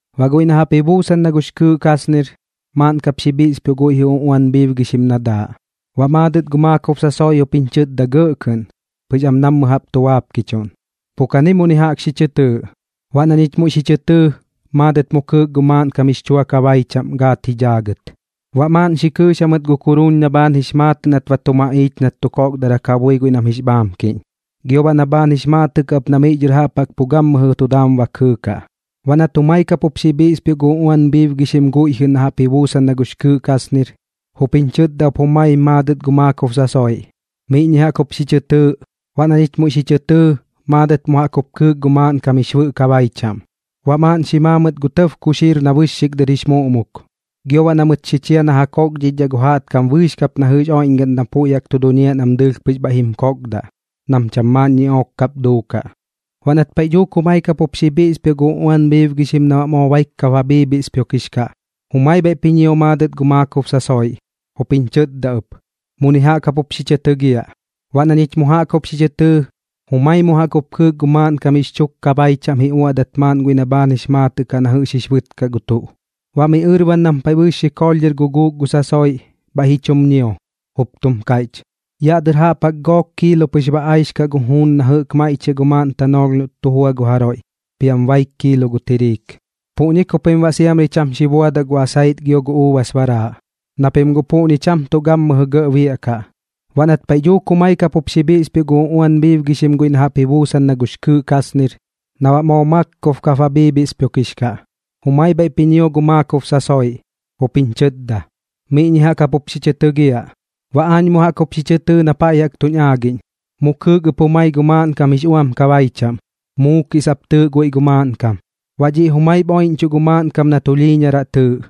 Baꞌ guiꞌ na jaꞌp ji buusan na gux kɨɨꞌ kasnir, maaꞌn kap xi bhiꞌspioꞌ guiꞌ jɨꞌ uꞌuan bhiibgixim na daaꞌ. Baꞌ maadɨt gu maakob sasoiꞌ jup jiñ chɨtda gɇꞌ kɨꞌn, pɨx am nammɨ jaꞌp tu baapkichuꞌn: ―Pu kani muni jaꞌk xi chɨ tɨɨꞌ. Baꞌ na ñich muiꞌ xi chɨ tɨɨ, maadɨt mu kɨɨk gu maaꞌnkam jix chua kabai chaꞌm gaat ji dhaagɨt. Baꞌ maaꞌn xi kɨɨx jamɨt gu kuruun na bhaan jix maatɨꞌ nat ba tu maꞌiich nat tu kokdarak ja bui guiꞌ nam jix bhaamkiꞌñ, gio baꞌ na bhaan jix maatɨꞌ kaꞌ ɨp na miꞌ dhɨr jaꞌp jaꞌk gammɨjɨ tu daam ba kɨɨkaꞌ. Baꞌ nat jumai kap jup xi bhiꞌspioꞌ gu uꞌuan bhiibgixim guiꞌ jɨꞌ na jaꞌp ji buusan na gux kɨɨꞌ kasnir, jup jiñ chɨtda ɨp jumai maadɨt gu maakob sasoiꞌ: ―Miꞌñi jaꞌk jup xi chɨ tɨɨꞌ. Baꞌ na ñich muiꞌ xi chɨ tɨɨ, maadɨt mu jaꞌk jup kɨɨk gu maaꞌnkam jix bɨꞌ kabai chaꞌm. Baꞌ maaꞌn xi maa mɨt gu tɇb kuxiir na bɨxxik dɨr jix muꞌmuk, gio baꞌ na mɨt xi chia na ja kokdhichdhaꞌ gu jaꞌtkam bɨɨx kap na jɨꞌx oiꞌñgaꞌn na puiꞌ jaꞌk tu duñiaꞌ nam dɨɨlh pɨx bhaiꞌ jim kokdaꞌ, nam cham maaꞌn ñiꞌook kap duukaꞌ. Baꞌ nat paiꞌ dhuuk jumai kap jup xi bhiꞌspioꞌ gu uꞌuan bhiibgixim na baꞌ moo baik kap ba bhiibhiꞌspioꞌkix kaꞌ, jumai bhaiꞌp ji ñio maadɨt gu maakob sasoiꞌ, jup jiñ chɨtda ɨp: ―Muni jaꞌk jap jup xi chɨ tɨgiaꞌ. Baꞌ na ñich mu jaꞌk jup xi chɨ tɨɨ, jumai mu jaꞌk jup kɨɨk gu maaꞌnkam jix chuk kabai chaꞌm ji uaꞌdat maaꞌn guiꞌ na bhaan jix maatɨꞌ kaꞌ na jɨꞌx jix bɨt kaꞌ gu tuꞌ. Baꞌ miꞌ ɨrban nam paiꞌ bɨɨx xikoolh dhɨr guguuk gu sasoiꞌ, bhaiꞌ ji chum ñio, jup tum kaiꞌch: ―Yaꞌ dɨr jaꞌp jaꞌk gook kiilo pɨx ba aix kaꞌ gu juun na jɨꞌk maiꞌchiaꞌ gu maaꞌn tanoolh noꞌt tu jua gu jaroiꞌ, piam baik kiilo gu tiriik. Puꞌñi ku pim baꞌ siamri cham xi buadaꞌ gu asait gio gu uubas baraaꞌ, na pim guꞌ puꞌñi cham tuꞌ gammɨjɨ gɇꞌ biaꞌkaꞌ. Baꞌ nat paiꞌ dhuuk jumai kap jup xi bhiꞌspioꞌ gu uꞌuan bhiibgixim guiꞌ na jaꞌp ji buusan na gux kɨɨꞌ kasnir, na baꞌ moo maakob kap ba bhiibhiꞌspioꞌkix kaꞌ, jumai bhaiꞌp ji ñio gu maakob sasoiꞌ, jup jiñ chɨtda: ―Miꞌñi jaꞌk jap jup xi chɨ tɨgiaꞌ. Baꞌ aañ mu jaꞌk jup xi chɨ tɨɨ na paiꞌ jaꞌk tuñ aagiꞌñ. Mu kɨɨk ɨp jumai gu maaꞌnkam jix uam kabai chaꞌm, Muukiꞌ sap tɨɨꞌ guiꞌ gu maaꞌnkam. Baꞌ dhiꞌ jumaip oiꞌñchuꞌ gu maaꞌnkam na Tulhiiñaraꞌ tɨɨꞌ,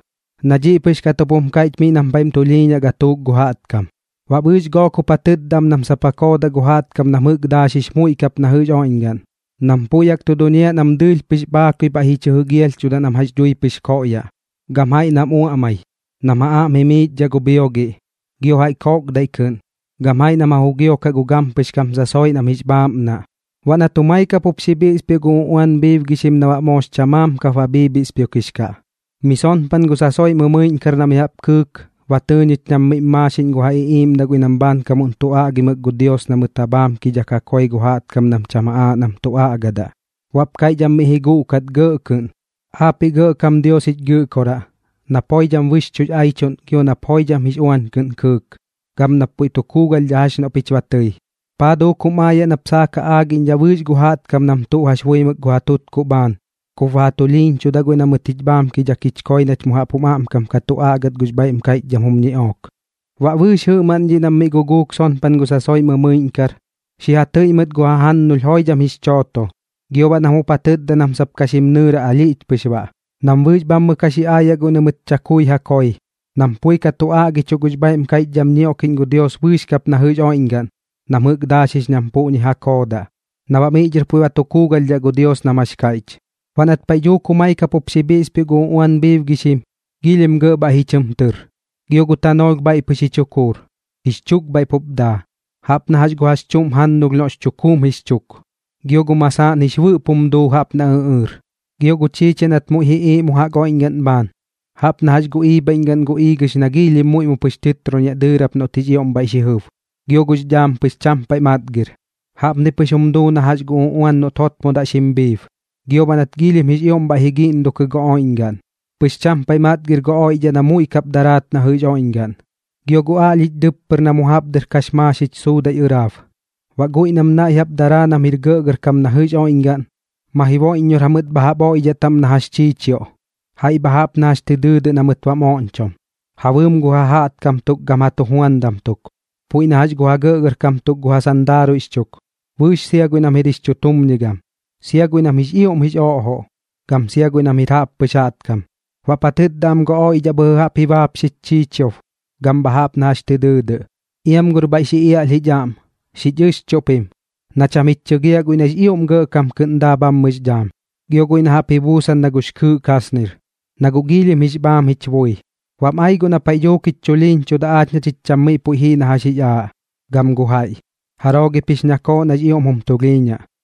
na dhiꞌ pɨx kat jup jum kaiꞌch miꞌ nam paiꞌm tulhiiñaꞌ gatuuk gu jaꞌtkam. Baꞌ bɨɨx gook jup ja tɨtda am nam sap ja koodaꞌ gu jaꞌtkam nam jɨꞌk daaxix muiꞌ kap na jɨꞌx oiꞌñgaꞌn, nam puiꞌ jaꞌk tu duñiaꞌ nam dɨɨlh pɨx bhaakui bhaiꞌ ji chɨ jɨgialhchudaꞌ nam jax dhui pɨx koꞌyaꞌ, gam jaiꞌ nam uaꞌmai, nam ja aꞌm jimiichdhaꞌ gu bhiogiꞌ, gio jaiꞌ koꞌkdaiꞌ kɨꞌn, gam jaiꞌ nam ja jugiokaꞌ gu gampɨx kam sasoiꞌ nam jix bhaaꞌmnaꞌ. Baꞌ nat jumai kap jup xi bhiꞌspioꞌ gu uꞌuan bhiibgixim na baꞌ moox chamaam kap ba bhiibhiꞌspioꞌkix kaꞌ, mi sonpan gu sasoiꞌ mɨmɨiꞌñkar na mi jaꞌp kɨɨk, ba tɨɨ ñich nam miꞌm maaxiꞌñ gu ja iꞌiiꞌmdaꞌ guiꞌ nam bhaankamuꞌn tu aꞌgimɨk gu Dios na mɨt ja bhaamkidhak ja koi gu jaꞌtkam nam cham aaꞌ nam tu aꞌgadaꞌ. Baꞌp kaiꞌch am miꞌ ji guꞌkat gɇꞌ kɨꞌn: ―Aapiꞌ Gɇꞌkam Dios jich Gɨꞌkoraꞌ, nap joidham bɨxchuꞌx aichuꞌn gio nap joidham jix uañ kɨꞌn kɨɨk, gam nap puiꞌ tu kuugalhdhaꞌ jax noꞌ pich ba tɨi, ¿paa duuk jum aayaꞌ nap saak ja aagiꞌñdhaꞌ bɨɨx gu jaꞌtkam nam tuꞌ jax buimɨk gu ja tutkuꞌ bhaan kup ba ja tulhiiñchudaꞌ guiꞌ na mɨt jich bhaamkidhak jich koi nach mu jaꞌp jum aꞌmkam ka tu aꞌgat gux bhaiꞌm kaiꞌchdham jum ñiꞌook? Baꞌ bɨɨx jɨꞌmaꞌn dhiꞌ nam miꞌ guguuk sonpan gu sasoiꞌ mɨmɨiꞌñkar, xi ja tɨiꞌ mɨt gu jajannulh joidham jix chooto, gio baꞌ nam jup ja tɨtda nam sap ka xim nɨɨraꞌ alhiꞌch pɨx baꞌ, nam bɨɨx bhammɨ ka xi aayaꞌ guiꞌ na mɨt chakui ja koi, nam pui ka tu aꞌgichuꞌ gux bhaiꞌm kaiꞌchdham ñioꞌkiꞌñ gu Dios bɨɨx kap na jɨꞌx oiꞌñgaꞌn nam jɨꞌk daaxix nam puꞌñi ja koodaꞌ, na baꞌ miꞌ dhɨr puiꞌ ba tu kuugalhdhaꞌ gu Dios nam jax kaiꞌch. Baꞌ nat paiꞌ dhuuk jumai kap jup xi bhiꞌspioꞌ gu uꞌuan bhiibgixim, giilhim gɇꞌ bhaiꞌ ji chɨm tɨr, gio gu tanoolh bhaiꞌ pɨx ji chukuur, jix chuk bhaiꞌ pup daa, jaꞌp na gu jax chuꞌm jannulh noꞌx chukuum jix chuk, gio gu masaaꞌn jix bɨꞌp jum duu jaꞌp na ɨꞌɨɨr. Gio gu chiichiaꞌ nat muiꞌ ji iiꞌ mu jaꞌk oiꞌñgaꞌn bhaan, jaꞌp na jax gu iibhaiꞌñgaꞌn gu iigɨx na giilhim muiꞌ mu pɨx tɨtroniaꞌ dɨɨrap noꞌt jix ioꞌm bhaiꞌ xi jɨb. Gio gux dhaam pɨx cham paiꞌ matgir, jaꞌpni pɨx jum duu na jax gu uꞌuan noꞌt jotmodaꞌ xim bhiib. Gio baꞌ nat giilhim jix ioꞌm bhaiꞌ ji giꞌndokɨ gu oiꞌñgaꞌn, pɨx cham paiꞌ matgir gu oiꞌdhaꞌ na muiꞌ kap ka daraat na jɨꞌx oiꞌñgaꞌn, gio gu aꞌlhich dɨppɨr na mu jaꞌp dɨr kax maaxich suudaiꞌ ɨraab. Baꞌ guiꞌ nam naiꞌ jaꞌp daraa nam jir gɇꞌgɇrkam na jɨꞌx oiꞌñgaꞌn, ma jiboiꞌññor jamɨt bha jaꞌp oiꞌdhaꞌ taꞌm na jax chiichioꞌ, jaiꞌ bha jaꞌp na jax tɨ dɨɨdɨꞌ na mɨt bam oꞌñchom, ja bɨɨm gu jajaꞌtkam tuk gam gu ja tujuandam tuk, puiꞌ na jax gu ja gɇꞌgɇrkam tuk gu ja sandaaruiꞌx chuk, bɨɨx sia guiꞌ nam jir jix chutumñigam, sia guiꞌ nam jix ioꞌm jix oꞌjoꞌ, gam sia guiꞌ nam jir jaꞌppɨx jaꞌtkam. Baꞌp ja tɨtda am gu oiꞌdhaꞌ bhɨjɨ jaꞌp ji baapxich chiichiob gam bha jaꞌp na jax tɨ dɨɨdɨꞌ: ―Iam gor bhaiꞌ xi iaꞌlh jich aꞌm, xich ɨxchuꞌ pim, na cham jich chɨgiaꞌ guiꞌ nax ioꞌm gɇꞌkam kɨꞌn daa bhammɨx dhaam, gio guiꞌ na jaꞌp ji buusan na gux kɨɨꞌ kasnir, na guꞌ giilhim jix bhaam jich bui. Bam ai guꞌ na paiꞌ dhuuk jich chulhiiñchudaꞌ aach na chich cham miꞌ puiꞌ jii na jax jix aaꞌ, gam gu jaiꞌ. ¿Jaroo gip jix ñakooꞌ nax ioꞌm jum tulhiiñaꞌ?